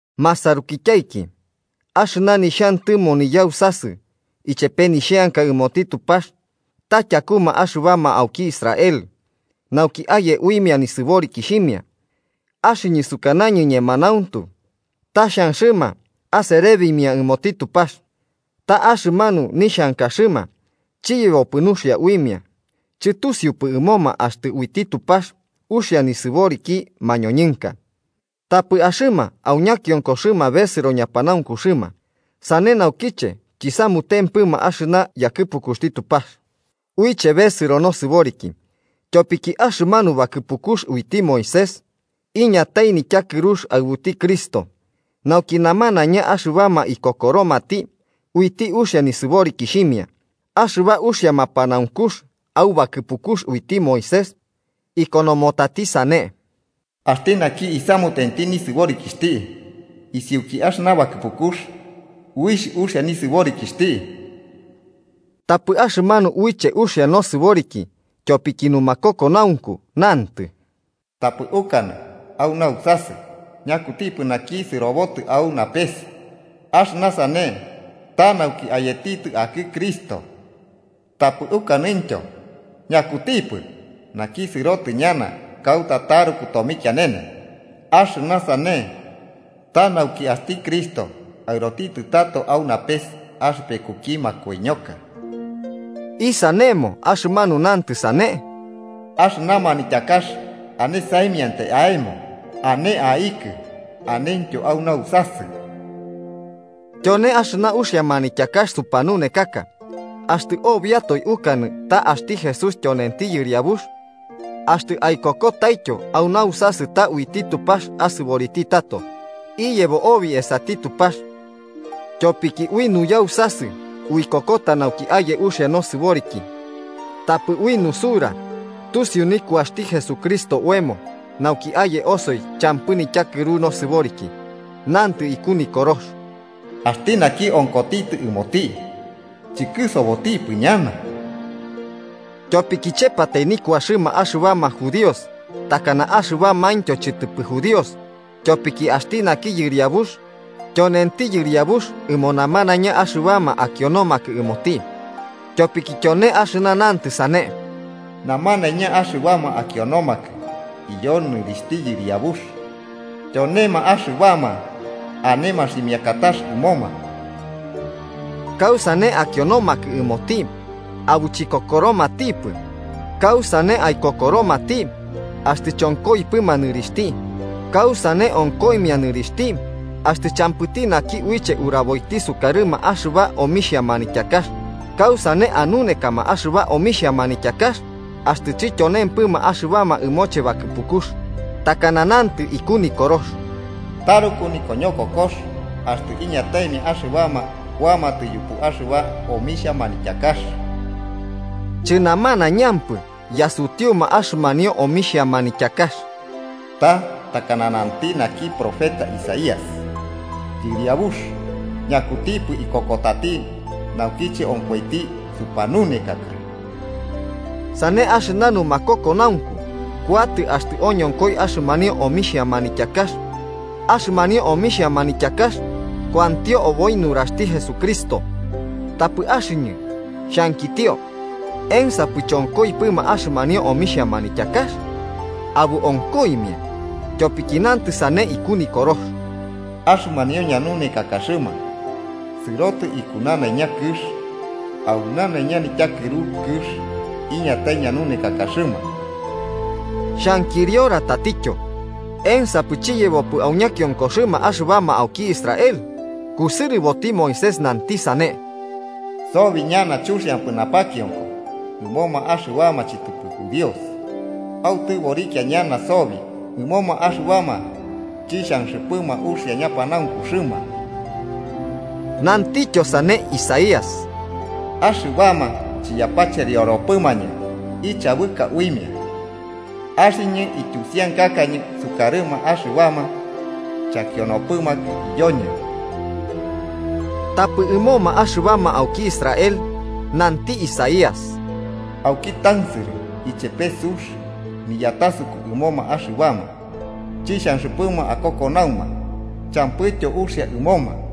Masarukityaiki, axɨna nixhantɨmo niyausasɨ ichepe nixheanka ɨmoti Tupax ta tyakuma axɨbama auki Israel nauki aye uimia nisɨborikixhimia. Axɨñɨ sukanañɨ ñemanauntu ta xhanxɨma aserebimia ɨmoti Tupax. Ta axɨmanu nixhankaxɨma chiyebopɨ nuxia uimia. Chɨtusiupɨ ɨmoma axtɨ uiti Tupax uxia nisɨboriki mañoñɨnka, tapɨ axɨma au ñakionkoxɨma besɨro ñapanaunkuxɨma. Sane naukiche chisamutempɨma axɨna yakɨpukuxti Tupax uiche besɨro nosɨboriki. Tyopiki axɨmanu bakɨpukux uiti Moisés iñatai nityakɨrux aɨbuti Cristo, nauki namanaiña axɨbama ikokoromati uiti uxia nisɨborikixhimia. Axɨba uxia mapanaunkux au bakɨpukux uiti Moisés ikonomotati sane: “Axti naki isamutenti nisɨborikixhti isiuki axɨna bakɨpukux, uixh uxia nisɨborikixhti.” Tapɨ axɨmanu uiche uxia nosɨboriki tyopiki numakokonaunku nantɨ: “Tapɨ ukanɨ au nausasɨ: ‘¿Ñakutipɨ naki sɨrobotɨ au napes?’–axɨna sane, ta nauki ayetitɨ akɨ Cristo–. Tapɨ ukanɨntyo ‘¿Ñakutipɨ naki sɨrotitɨ ñana kauta taruku tomikianene?’”–axɨna sane, ta nauki axti Cristo aɨrotitɨ tato au napes axɨpekukimia makoiñoka. ¿Isanemo axɨmanu nantɨ sane?: “Axɨna manityakax ane saimiantai aemo, ane aikɨ anentyo au nausasɨ.” Tyone axɨna uxia manityakax supanunekaka. Axtɨ obiatoe ukanɨ ta axti Jesús tyonenti Yɨriabux axtɨ aikokotaityo au nausasɨ ta uiti Tupax asɨboriti tato, iyebo obi esati Tupax. Tyopiki ui nuyausasɨ uikokota nauki aye uxia nosɨboriki tapɨ ui nusaru tusiu nikuaxti Jesucristo oemo nauki aye osi champɨ nityakɨru nosɨboriki. Nantɨ iku Nikorox: “Axti naki onkotitɨ ɨmoti, chɨkɨsobotipɨ ñana.” Tyopiki chepatai nikuaxɨma axɨbama judíos takana axɨbamaintyo chɨtɨpɨ judíos. Tyopiki axti naki Yɨriabux tyonenti Yɨriabux ɨmo namanaina axɨbama akionomakɨ ɨmoti. Tyopiki tyone axɨna nantɨ sane: “Namanaiña axɨbama akionomakɨ iyo nɨrixhti Yɨriabux, tyonema axɨbama ane maximiakatax ɨmoma.” ¿Kausane akionomakɨ ɨmoti, abo chikokoromatipɨ? ¿Kausane aikokoromati, axtɨ chonkoipɨma nɨrixhti? ¿Kausane onkoimia nɨrixhti axtɨ champɨti naki uiche uraboiti sukarɨma axɨba omixhia manityakax? ¿Kausane anunekama axɨba omixhia manityakax axtɨ chɨtyonempɨma axɨbama ɨmoche bakɨpukux? Takana nantɨ iku Nikorox: “¡Taruku nikoñokokox axtɨ iñataimia axɨbama kuamatɨ yupu axɨba omixhia manityakax!” Chɨnamanaiñampɨ yasutiuma axɨmanio omixhia manityakax. Ta takana nanti naki profeta Isaías: “Yɨriabux, ¿Ñakutipɨ ikokotati naukiche onkoiti supanunekaka?” Sane, axɨna numakokonaunku kuatɨ axtɨ oñonkoi axɨmanio omixhia manityakax, axɨmanio omixhia manityakax kuantio oboi nuraxti Jesucristo. Tapɨ axɨñɨ xhankitio: ¿Ensapɨ chonkoipɨma axɨmanio omixhia manityakax? ¡Abo onkoimia! Tyopiki nantɨ sane iku Nikorox: “Axɨmanio ñanunekakaxɨma sɨrotɨ iku nanaiña kɨx au nanaiña nityakɨru kɨx iñatai ñanunekakaxɨma.” Xhankiriora tatityo: ¿Ensapɨ chiyebopɨ au ñakiokoxɨma axɨbama auki Israel? Kusɨrɨboti Moisés nanti sane: “Sobi ñana chuxiampɨ napakionko ɨmoma axɨbama chɨtɨpɨ judíos. Autɨborikia ñana sobi ɨmoma axɨbama chixhanxɨpɨma uxia ñapanaunkuxɨma.” Nantityo sane Isaías: “Axɨbama chiyapacherioropɨmañɨ ichabɨka uimia. Axɨñɨ ityusiankakañɨ sukarɨma axɨbama chakionopɨmakɨ iyoñɨ.” Tapɨ ɨmoma axɨbama auki Israel nanti Isaías: “Auki tansɨrɨ ichepe sux niyatasuku ɨmoma axɨbama chixhanxɨpɨma akokonauma champɨityo uxia ɨmoma.”